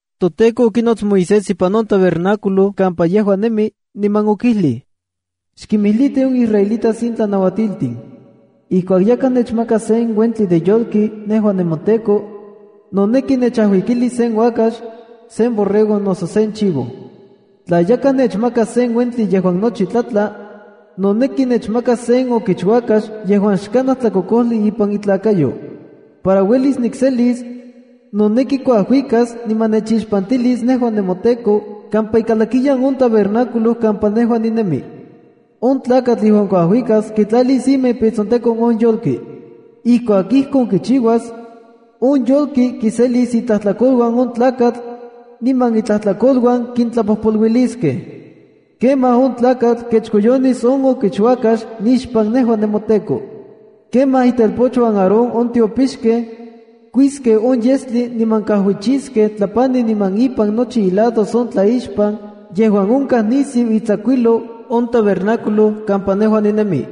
ToTEKO okinots Moisés ipan on tabernáculo kampa yejua nemi, niman okijlij: “Xkinmijliti on israelitas in tlanauatiltin. Ijkuak yakaj nechmakas sen uentli de yolki nejua nemoTEKO, noneki nechajuikilis sen uakax, sen borrego noso sen chivo. ’Tla yakaj nechmakas sen uentli yejuan nochi tlatla, noneki nechmakas sen okichuakax yejuan xkanaj tlakokojli ipan itlakayo. Para uelis nikselisa, noneki kuajuikas niman nechixpantilis nejua nemoTEKO, kampa ikalakiyan on tabernáculo kampa nejua ninemi. On tlakatl yejuan kuajuikas kitlalis ima ipan itsontekon on yolki. Ijkuak ijkon kichiuas, on yolki kiselilis itlajtlakoluan on tlakatl, niman itlajtlakoluan kintlapojpoluiliskej. Kemaj on tlakatl kechkoyonis on okichuakax nixpan nejua nemoTEKO. Kemaj itelpochuan Aarón, on tiopixkej, kuiskej on yestli niman kajuichiskej tlapani niman ipan nochi ilados on tlaixpan, yejuan onkaj nisiu itsakuijlou on tabernáculo kampa nejua ninemi.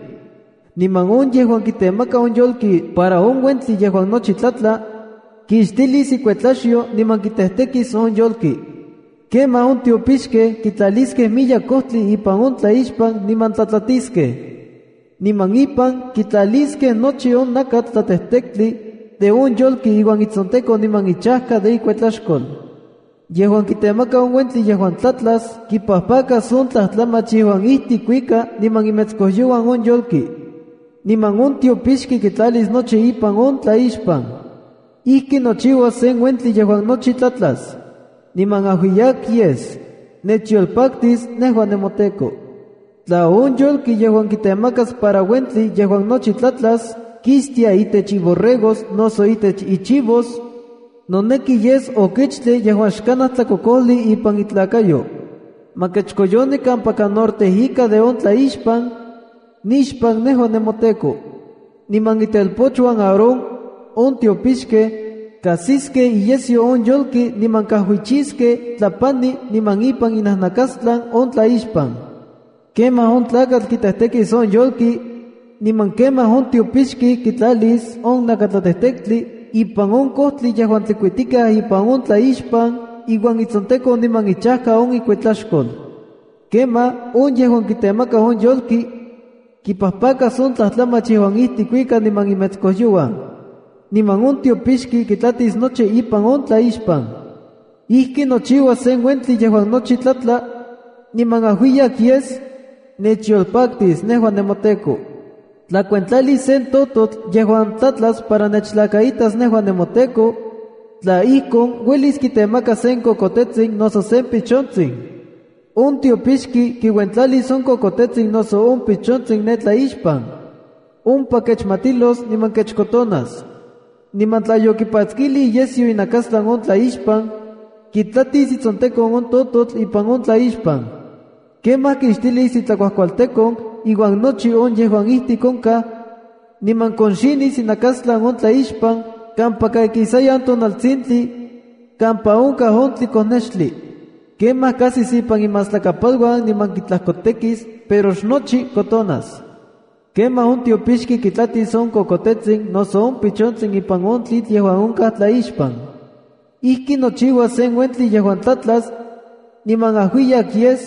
Niman on yejuan kitemaka on yolki para on uentli yejuan nochi tlatla, kixtilis ikuetlaxyo niman kitejtekis on yolki. Kemaj on tiopixkej kitlaliskej miyek kojtli ipan on tlaixpan niman tlatlatiskej, niman ipan kitlaliskej nochi on nakatl tlatejtektli de on yolki iuan itsontekon niman ichajka de ikuetlaxkol. Yejuan kitemaka on uentli yejuan tlatlas, kipajpakas on tlajtlamach yejuan ijtik kuika niman imetskojyouan on yolki. Niman on tiopixki kitlalis nochi ipan on tlaixpan. Ijki nochiuas sen uentli yejuan nochi tlatlas, niman ajuiyak yes, nechyolpaktis nejua nemoTEKO. ’Tla on yolki yejuan kitemakas para uentli yejuan nochi tlatlas, kixtia itech iborregos noso itech ichivos, noneki yes okichtli yejuan xkanaj tlakokojli ipan itlakayo. Ma kechkoyoni kampaka norte ika de on tlaixpan, nixpan nejua nemoTEKO. Niman itelpochuan Aarón, on tiopixkej, kajsiskej iyesyo on yolki niman kajuichiskej tlapani niman ipan inajnakastlan on tlaixpan. Kemaj on tlakatl kitejtekis on yolki, niman kemaj on tiopixki kitlalis on nakatlatejtektli ipan on kojtli yejuan tlikuitikaj ipan on tlaixpan iuan itsontekon niman ichajka on ikuetlaxkol. Kemaj on yejuan kitemaka on yolki, kipajpakas on tlajtlamach yejuan ijtik kuika niman imetskojyouan. Niman on tiopixki kitlatis nochi ipan on tlaixpan. Ijki nochiuas sen uentli yejuan nochi tlatla, niman ajuiyak yes, nechyolpaktis nejua nemoTEKO. ’Tla kuentlalis sen tototl yejuan tlatlas para nechtlakaitas nejua nemoTEKO, tla ijkon, uelis kitemakas sen kokotetsin noso sen pichontsin. On tiopixki kiuentlalis on kokotetsin noso on pichontsin ne tlaixpan. Ompa kechmatilos niman kechkotonas. Niman tla yokipatskilij iyesyo inakastlan on tlaixpan, kitlatis itsontekon on tototl ipan on tlaixpan. Kemaj kixtilis itlakuajkualtekon iuan nochi on yejuan ijtik onkaj, niman konxinis inakastlan on tlaixpan kampaka ikisayan tonaltsintli, kampa onkaj on tlikonextli. Kemaj kajsis ipan imajtlakapaluan niman kitlajkotekis, pero xnochi kotonas. Kemaj on tiopixki kitlatis on kokotetsin noso on pichontsin ipan on tlitl yejuan onkaj tlaixpan. Ijki nochiuas sen uentli yejuan tlatlas, niman ajuiyak yes,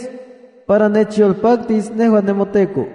para nechyolpaktis nejua nemoTEKO.